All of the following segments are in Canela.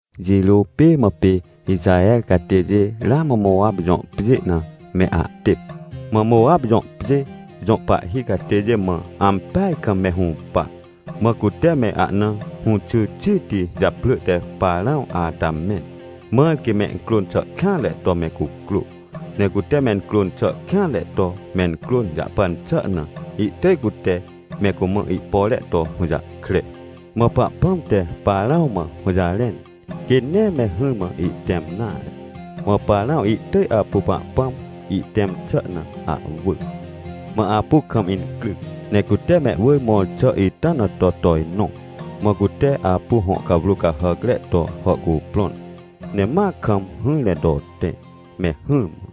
Jirô pê mã pê Ixaher catêjê ramã Mowap jõ pjê na me ahtêp. Mã Mowap jõ pjê jõ pahhi catêjê mã ampeaj kam me hũpa, mã cute me ahna hũxy xiti japrỳ te Parãw ata mẽn, mãr quê mencrôn xà kêanre to me cucrô. Ne cute mencrôn xà kêanre to mencrôn jahpan xà na, ihtỳj cute me cumã ihpore to hũjahkre. Mã Pahpãm te Parãw mã hũjarẽn, quê nee me hỹrmã ihtẽm nare. Mã Parãw ihtỳj apu Pahpãm ihtẽm xà na ahwỳ. Mã apu kam incryc, ne cute mehwỳr mõr xà ita na to tojnõ. Mã cute apu hõ cawrô cahàcre to hàhcuprõn, ne ma kam hỹr ne to tẽ, me hỹrmã.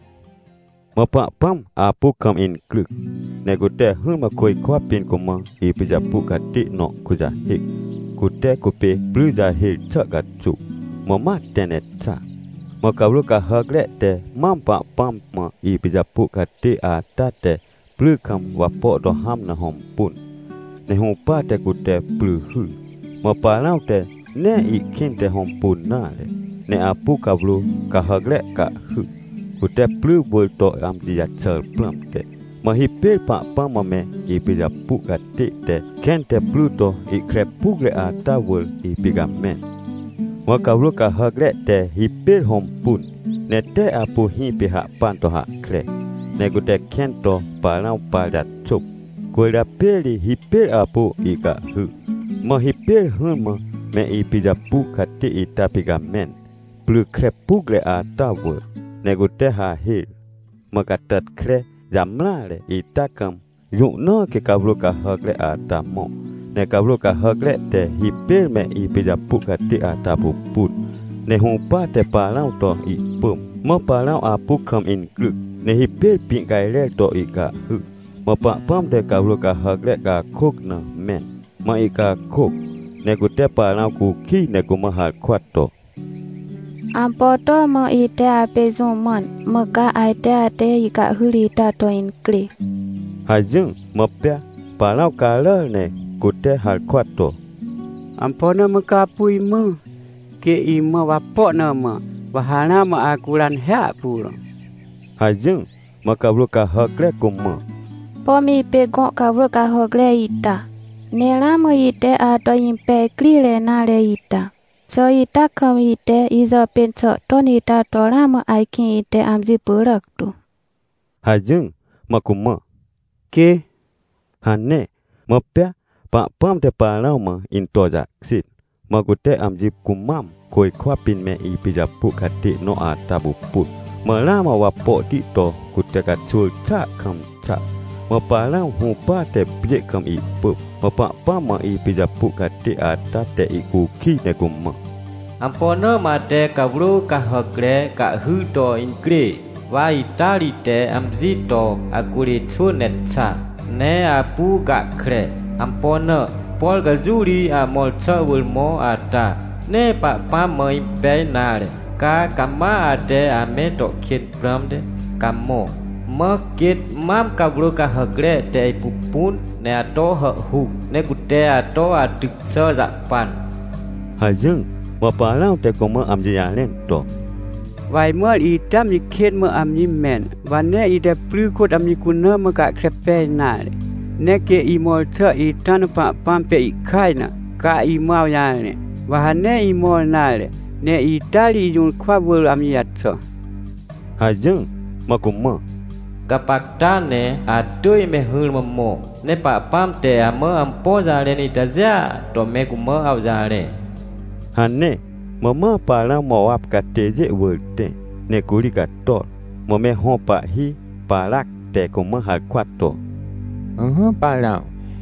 Mã Pahpãm apu kam incryc, ne cute hỹrmã côjkwa pĩn cumã ipijapu catê nõ kujahêc, cute cupê pry jahêr xà caxuw. Mã ma tẽ ne xa. Mã cawrô cahàcre te mam Pahpãm mã ipijapu catê ata te pry kam wapo to hãm na hõmpun, ne hũpate cute pry hyr. Mã Parãw te nee ihkĩnte hõmpun nare, ne apu cawrô cahàcre cahhy, cute pry wỳr to amji jaxàr prãmte. Mã hipêr Pahpãm mã me ipijapu catê te kẽn te pry to ihkre pucre ata wỳr ipicamẽn. Mã cawrô cahàcre te hipêr hõmpun, ne tee apu hĩpê hahpan to hahkre, ne cute kẽn to Parãw par jaxôp. Cwỳrjapê ri hipêr apu ihcahhy. Mã hipêr hỹrmã me ipijapu catê ita picamẽn, pry kre pucre ata wỳr. Ne cute hahêr. Mã catàtkre jamreare ita kam, jũ na quê cawrô cahàcre ata mõ. Ne cawrô cahàcre te hipêr me ipijapu catê ata pupun, ne hũpate Parãw to ihpỳm. Mã Parãw apu kam incryc ne hipêr pĩ cajrer to ihcahhy. Mã Pahpãm te cawrô cahàcre cakôc na mẽn, mã ihcakôc, ne cute Parãw cukij ne cumã harkwa to: — Ampo to mã ite apê jũ mãn, mã ca ajte ate icahhyr ita to incrê? — hajỹr. Mã pea Parãw caràr ne cute harkwa to: — Ampo na mã ca apu imã? Quê imã wapo na mã, wa ha ramã acuran hiahpuro — hajỹr. Mã cawrô cahàcre cumã: — Pom ipê gõ cawrô cahàcre ita, ne ramã ite ato impej crire nare ita. Xà ita kam ite ijàpên xà ton ita to ramã ajkĩ ite amji pyràc tu? — hajỹr. Mã cumã: — Quê — hane. Mã pea Pahpãm te Parãw mã into jahkjên. Mã cute amji cumam côjkwa pĩn me ipijapu catê nõ ata pupun. Mã ramã wapohti to cute caxwỳr xàa kam xa. Mã Parãw hũpate pjê kam ihpỳm. Mã Pahpãm mã ipijapu catê ata te ihcukij ne cumã: — Ampo na mã ate cawrô cahàcre cahhyr to incrê? Wa ita ri ite amji to acurê xwỳn ne xa, ne apu gahkre. Ampo na? Por ca jũ ri amõr xà wỳr mõ ata, nee Pahpãm mã impej nare. Ca cama ate ame to kên prãmte, ca mõ. Mã quêt mam cawrô cahàcre te ipupun ne ato hàhhuc, ne cute ato atyc xà jahpan — hajỹr. Mã Parãw te cumã amji jarẽn to: — Wa ajmãr itea amji kên mã amji mẽn, wa nee ite pry kôt amji cuna mã gahkre pej nare. Ne quê imõr xà ita na Pahpãm pê ihkaj na, ca imã awjarẽ, wa ha nee imõr nare, ne ita ri ijũrkwa wỳr amji jaxà — hajỹr. Mã cumã: — Gapacta ne atỳj me hỹrmã mõ, ne Pahpãm te amã ampo jarẽn itajêa to me cumã awjarẽ — hane. Mã ma Parãw Mowap catêjê wỳr tẽ, ne curi cator. Mã me hõ pahhi Parac te cumã harkwa to: — Ỹhỹ Parãw,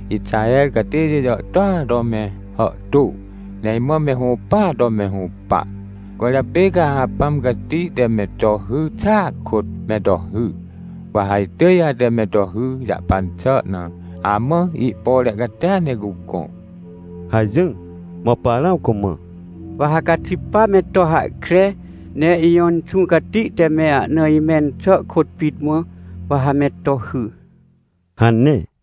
Ixaher catêjê jàhtôa to me hàhtô, ne imã me hũpaa to me hũpa. Cwỳrjapê ca ha Apãm Cati te me to hy xàa kôt me to hy, wa ha itỳj ate me to hy jahpan xà na amã ihpore catia ne cugõ — hajỹr. Mã Parãw cumã: — Wa ha caxi, pa me to hahkre, ne ijõ Inxũ Cati te me ahna imẽn xà kôt pit mã, wa ha me to hy — hane.